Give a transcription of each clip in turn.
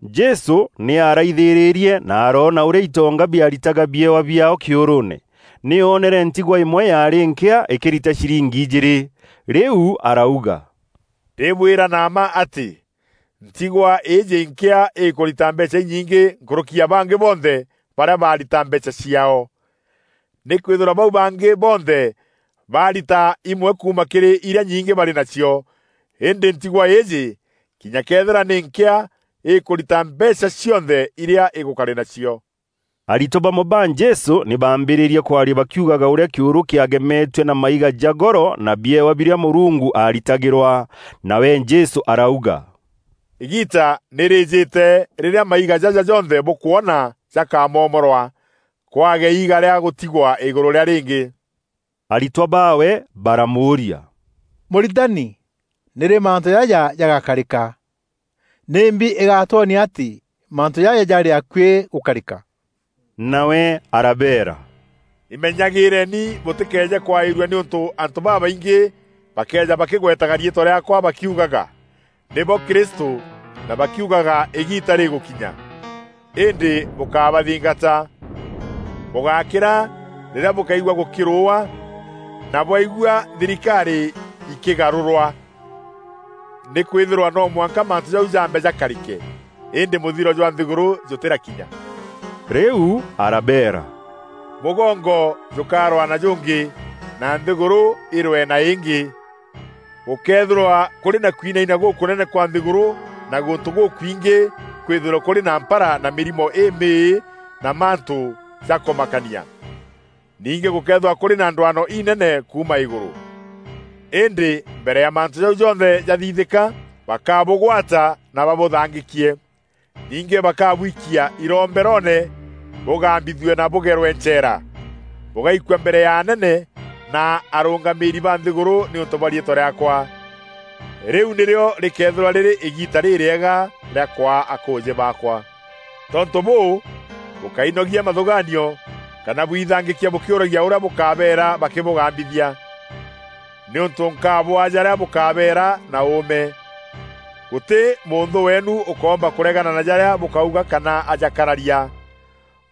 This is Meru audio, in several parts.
Jesû nî aaraithîrîrie na aroona ûrîa itonga biaritaga biewa biaao kîûrûûne. Nî oonere ntigwa îmwe yaarî nkîa îkîrita ciringi ijîîrî. Rîu arauga “Ndîbwîra na mma atî, ntigwa îîjî nkîa îkûrita mbeecha inyingî nkûrûki ya bangî bonthe barîa barita mbeecha ciaao. Nîkwîthîrwa bau bangî bonthe barita îmwe kuuma kîrî irîa nyingî barî nacio, îndî ntigwa îîjî, kinya këethîra nî nkîa, îkûrita mbeecha cionthe irîa îgûkarî nacio.” Aritwa bamwe ba Jesû nî baambîrîrie kwaria bakiugaga ûrîa kîûrû kîagemetue na maiga ja goro na biewa birîa Mûrungu aaritagîrwa. Nawe Jesû arauga, “Îgiita nî rîîjîte rîrîa maiga jaja jonthe bûkwona jakamomorwa, kwage iiga rîa gûtigwa îgûrû rîa rîngî.” Aritwa baawe baramûûria, “Mûritani, nîrî mantû jaja jagakarîka? Nîmbi îgaatwonia atî mantû jaja jarî akuî gûkarîka?” Nawe arabeera, “Imenyagîîreni bûtîkeeje kwaîrua nîûntû antû babaingî bakeeja bakigwetaga riîtwa rîaakwa bakiugaga, nîbo Kristû na bakiugaga îgiita rîgûkinya. Îndî bûkábathingata. Bûgákîra rîrîa bûkaigua gûkîrûûwa na bwaigua thirikarî ikîgarûrwa. Nîkwîthîrwa no mwanka mantû jau jambe jakarîke, îndî mûthiro jwa nthîgûrû jûtîrakinya.” Rîu arabeera, “Mûgongo jûkarwaa na jûngî, na nthîgûrû îrwee na îngî. Gûkeethîrwa kûrî na kwinaina gûkûnene kwa nthîgûrû na gûntû gûkwingî kwîthîrwe kûrî na mpara na mîrimo îmîî na mantû jakûmakania. Ningî gûkeethîrwa kûrî na ndwano inene kuuma îgûrû. Îndî mbere ya mantû jau jonthe jathithîka, bakabûgwata na babûthangîkie. Ningî bakabwikia iromberoone bûgambîthue na bûgerwe ncheera. Bûgaikua mbere ya anene na mûrûngamîîri ba nthîgûrû nîûntû bwa riîtwa rîaakwa. Rîu nîrîo rîkeethîrwa rîrî îgiita rîrîega rîa kwaa akûûjî baakwa. Tontû bûû, bûkáinogia mathûgaanio kana bwithangîkia bûkîûragia ûrîa bûkabeera bakîbûgambithia nîûntû nkabwaa jarîa bûkabeera na ûûme. Gûtî mûnthû weenu ûkoomba kûregana na jarîa bûkauga kana ajakararia.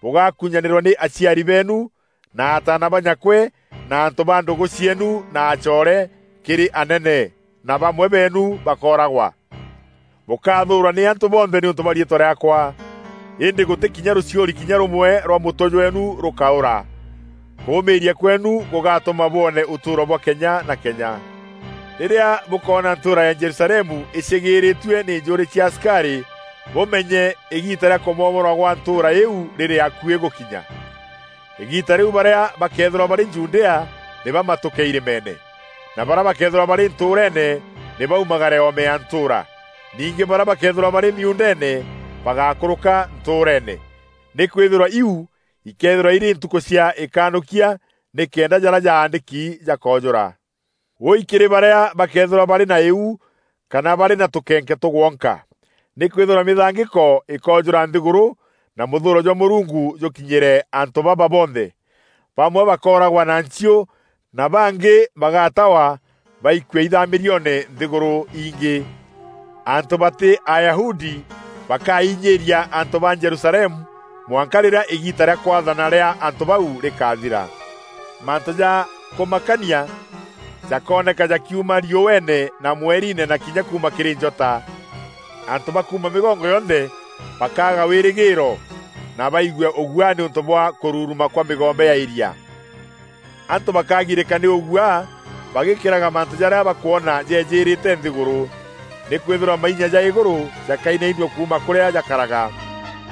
Bûgakûnyanîrwa nî aciari beenu, na ataana ba nyakwe na antû ba ndûgû cieenu na acoore, kîrî anene na bamwe beenu bakooragwa. Bûkathûûrwa nî antû bonthe nîûntû bwa riîtwa rîaakwa. Îndî gûtî kinya rûchiûri kinya rûmwe rwa mûtwe jweenu rûkaûra. Kûûmîria kweenu gûgatûma bwoone ûtûûro bwa kenya na kenya. “Rîrîa bûkoona ntûûra ya Jerusalemu îcîgîîrîîtue nî njûûrî cia asikarî, bûmenye îgiita rîa kûmomorwa kwa ntûûra îîu rîrî akuî gûkinya. Îgiita rîu barîa bakeethîrwa barî Judea nî bamatûke irîmeene, na barîa bakeethîrwa barî ntûûreene nî baumagare oome ya ntûûra. Ningî barîa bakeethîrwa barî miuundeene, bagákûrûka ntûûreene. Nîkwîthîrwa iu ikeethîrwa irî ntukû cia îkanûkia nîkenda jarîa jaandîki jakoojûra. “Wûûi kîrî barîa bakeethîrwa barî na îu kana barî na tûkenke tûgwonka! Nîkwîthîrwa mîthangîko îkoojûra nthîgûrû na mûthûûro jwa Mûrungu jûkinyîre antû baba bonthe. Bamwe bakooragwa na nchiû na bangî bagatawa baikue ithamîrioone nthîgûrû ingî. Antû batî Ayahudi bakainyîîria antû ba Jerusalemu mwanka rîrîa îgiita rîa kwaathana rîa antû bau rîkaathira.” “Mantû ja kûmakania jakooneka jakiuma riûeene na mweriine na kinya kuuma kîrî njota. Antû ba kuuma mîgongo yonthe bakaaga wîrîgîîro na baigue ûguaa nîûntû bwa kûruruma kwa mîgombe ya îria. Antû bakagirîka nî ûguaa bagîkîraga mantû jarîa bakwona jeejîîrîte nthîgûrû. Nîkwîthîrwa mainya ja îgûrû jakainainua kuuma kûrîa jakaraga.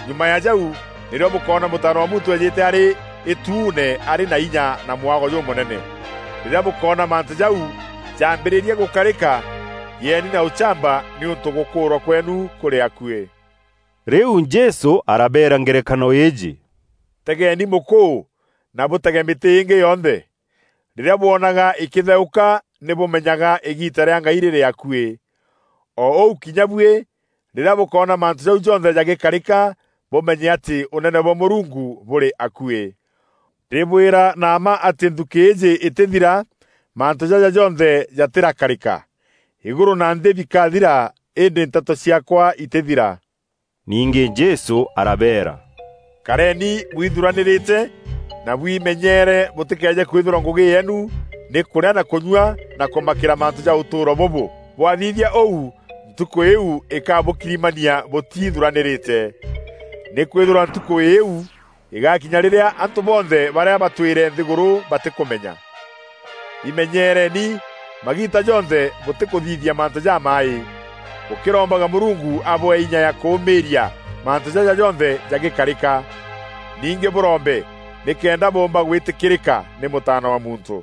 Nyuma ya jau nîrîo bûkoona Mûtaana wa Muntû eejîte arî îtuune arî na inya na mwago jûmûnene. Rîrîa bûkoona mantû jau jaambîrîria gûkarîka, gîeni na ûchamba nîûntû gûkûûrwa kweenu kûrî akuî.” Rîu Jesû arabeera ngerekano îîjî: “Tegeeni mûkûû, na bûtege mîtî ingî yonthe. Rîrîa bwonaga îkîtheûka, nî bûmenyaga îgiita rîa ngai rîrî akuî. O ûu kinya buî, rîrîa bûkoona mantû jau jonthe jagîkarîka, bûmenye atî Ûnene bwa Mûrungu bûrî akuî.” Ndîbwîra na mma atî nthukî îîjî îtîthira, mantû jaja jonthe jatîrakarîka. Îgûrû na nthî bikathira, îndî nteto ciaakwa itîthira. Ningî Jesû arabeera, “Kareeni bwithuranîrîte na bwimenyere bûtîkeeje kwîthîrwa ngûgî yeenu nî kûrîa na kûnyua na kûmakîra mantû ja ûtûûro bûbû. Bwathithia ûu Ntukû îîu îkabûkirimania bûtithûranîrîte. Nîkwîthîrwa Ntukû îîu îgaakinya rîrîa antû bonthe barîa batwîre nthîgûrû batîkûmenya. Îmenyereeni magiita jonthe bûtîkûthithia mantû jamaaî, bûkîrombaga Mûrungu abwee inya ya kûûmîîria mantû jaja jonthe jagîkarîka. Ningî bûrombe nîkenda bûûmba gwîtîkîrîka nî Mûtaana wa Muntû.”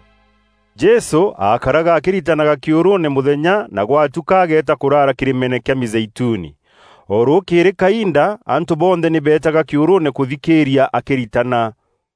Jesû aakaraga akîritanaga kîûrûûne mûthenya na gwatuka ageeta kûraara kîrîmeene kîa Mîzeituni. O rûûkîrî kainda antû bonthe nî beetaga kîûrûûne kûthikîîria akîritana.